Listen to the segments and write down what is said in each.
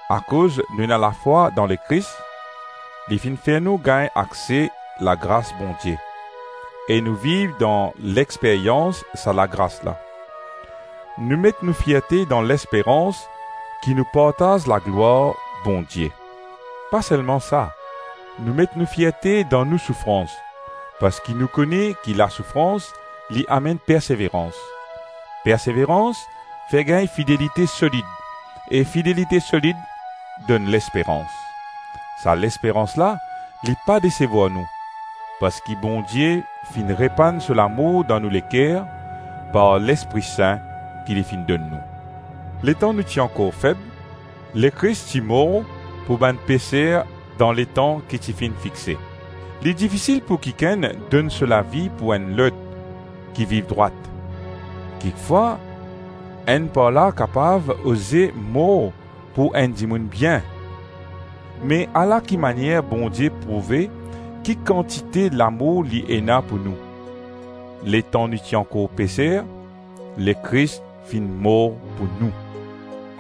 Akoz nou ena lafwa dan Lekris, li finn fer nou gagn akse lagras Bondie, e nou viv dan lexperyans sa lagras la. Nou met nou fierte dan lesperans ki nou partaz laglwar Bondie. Pa selma sa, nou met nou fierte dan nou soufrans, parski nou kone ki lasoufrans li amenn perseverans, perseverans fer gagn fidelite solid, e fidelite solid donn lesperans. Sa lesperans la li pa desevwar nou, parski Bondie finn repann so lamour dan nou leker par Lespri Sin ki li finn donn nou. Letan nou ti ankor feb, Lekris ti mor pou bann peser dan letan ki ti finn fixe. Li difisil pou kikenn donn so lavi pou enn lot ki viv drwat. Kikfwa enn par la kapav oze mor pou enn dimoun bien. Me ala kimanier Bondie prouve ki kantite lamour li ena pou nou: letan nou ti ankor peser, Lekris finn mor pou nou.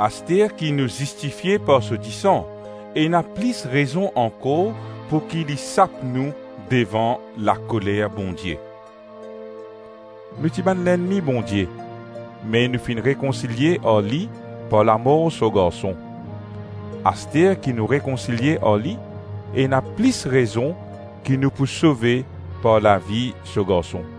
Aster ki nou zistifie par so disan, ena plis rezon ankor pouki li sap nou devan lakoler Bondie. Nou ti bann ennmi Bondie, me nou finn rekonsilie ar li par lamor so Garson; aster ki nou rekonsilie ar li, ena plis rezon ki nou pou sove par lavi so Garson.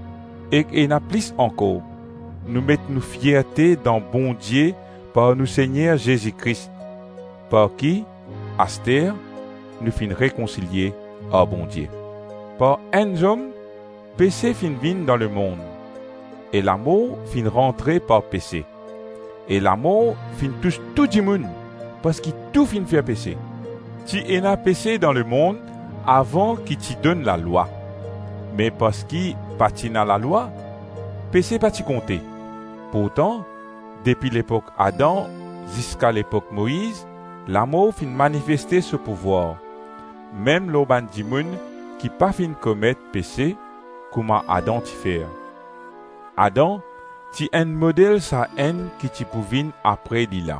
Ek ena plis ankor: nou met nou fierte dan Bondie par nou Segner Zezi Kris, par ki, aster, nou finn rekonsilie ar Bondie. Par enn zom pese finn vinn dan lemonn, e lamor finn rantre par pese, e lamor finn tous tou dimoun, parski tou finn fer pese. Ti ena pese dan lemonn avan ki ti donn Lalwa; me parski pa ti ena Lalwa, pese pa ti konte. Pourtan depi lepok Adam ziska lepok Moiz lamor finn manifeste so pouvwar, mem lor bann dimoun ki pa finn komet pese kouma Adam ti fer; Adam ti enn model Sa-Enn ki ti pou vinn apre li la.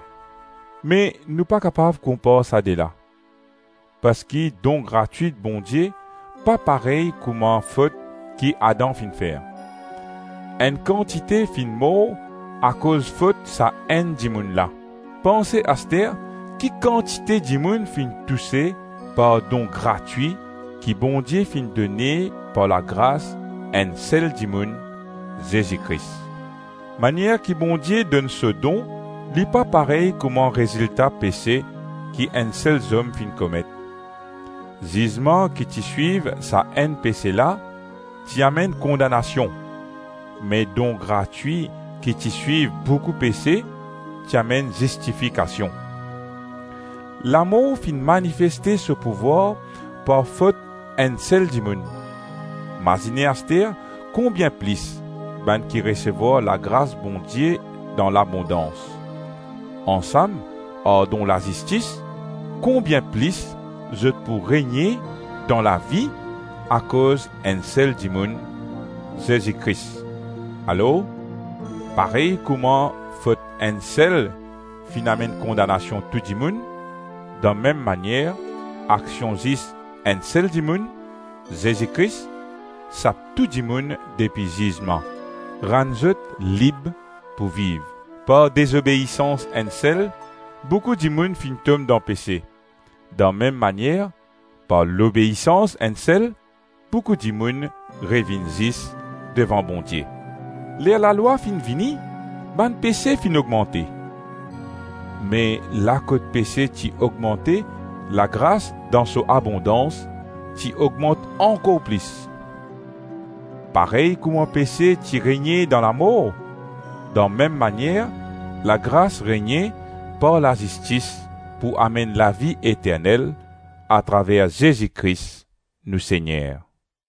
Me nou pa kapav konpar sa de la; parski don gratwi Bondie pa parey kouma fot ki Adam finn fer. Enn kantite finn mor akoz fot sa enn dimoun la; panse aster ki kantite dimoun finn touse par don gratwi ki Bondie finn done par lagras enn sel dimoun, Zezi Kris. Manier ki Bondie donn so don li pa parey kouma rezilta pese ki enn sel zom finn komet. Zizman ki ti swiv sa enn pese la, ti amenn kondanasion; me don gratwi ki ti swiv boukou pese ti amenn zistifikasion. Lamor finn manifeste so pouvwar par fot enn sel dimoun; mazine aster konbien plis bann ki resevwar lagras Bondie dan labondans, ansam ar don lazistis, konbien plis zot pou regne dan lavi akoz enn sel dimoun: Zezi Kris. Alor, parey kouma fot enn sel finn amenn kondanasion tou dimoun, dan mem manier aksion zis enn sel dimoun, Zezi Kris, sap tou dimoun depi zizman, rann zot lib pou viv. Par dezobeisans enn sel, boukou dimoun finn tom dan pese, dan mem manier, par lobeisans enn sel, boukou dimoun revinn zis devan Bondie. Ler Lalwa finn vini, bann pese finn ogmante. Me la kot pese ti ogmante, lagras dan so abondans ti ogmant ankor plis. Parey kouma pese ti regne dan lamor, dan mem manier lagras regne par lazistis pou amenn lavi eternel atraver Zezi Kris, nou Segner.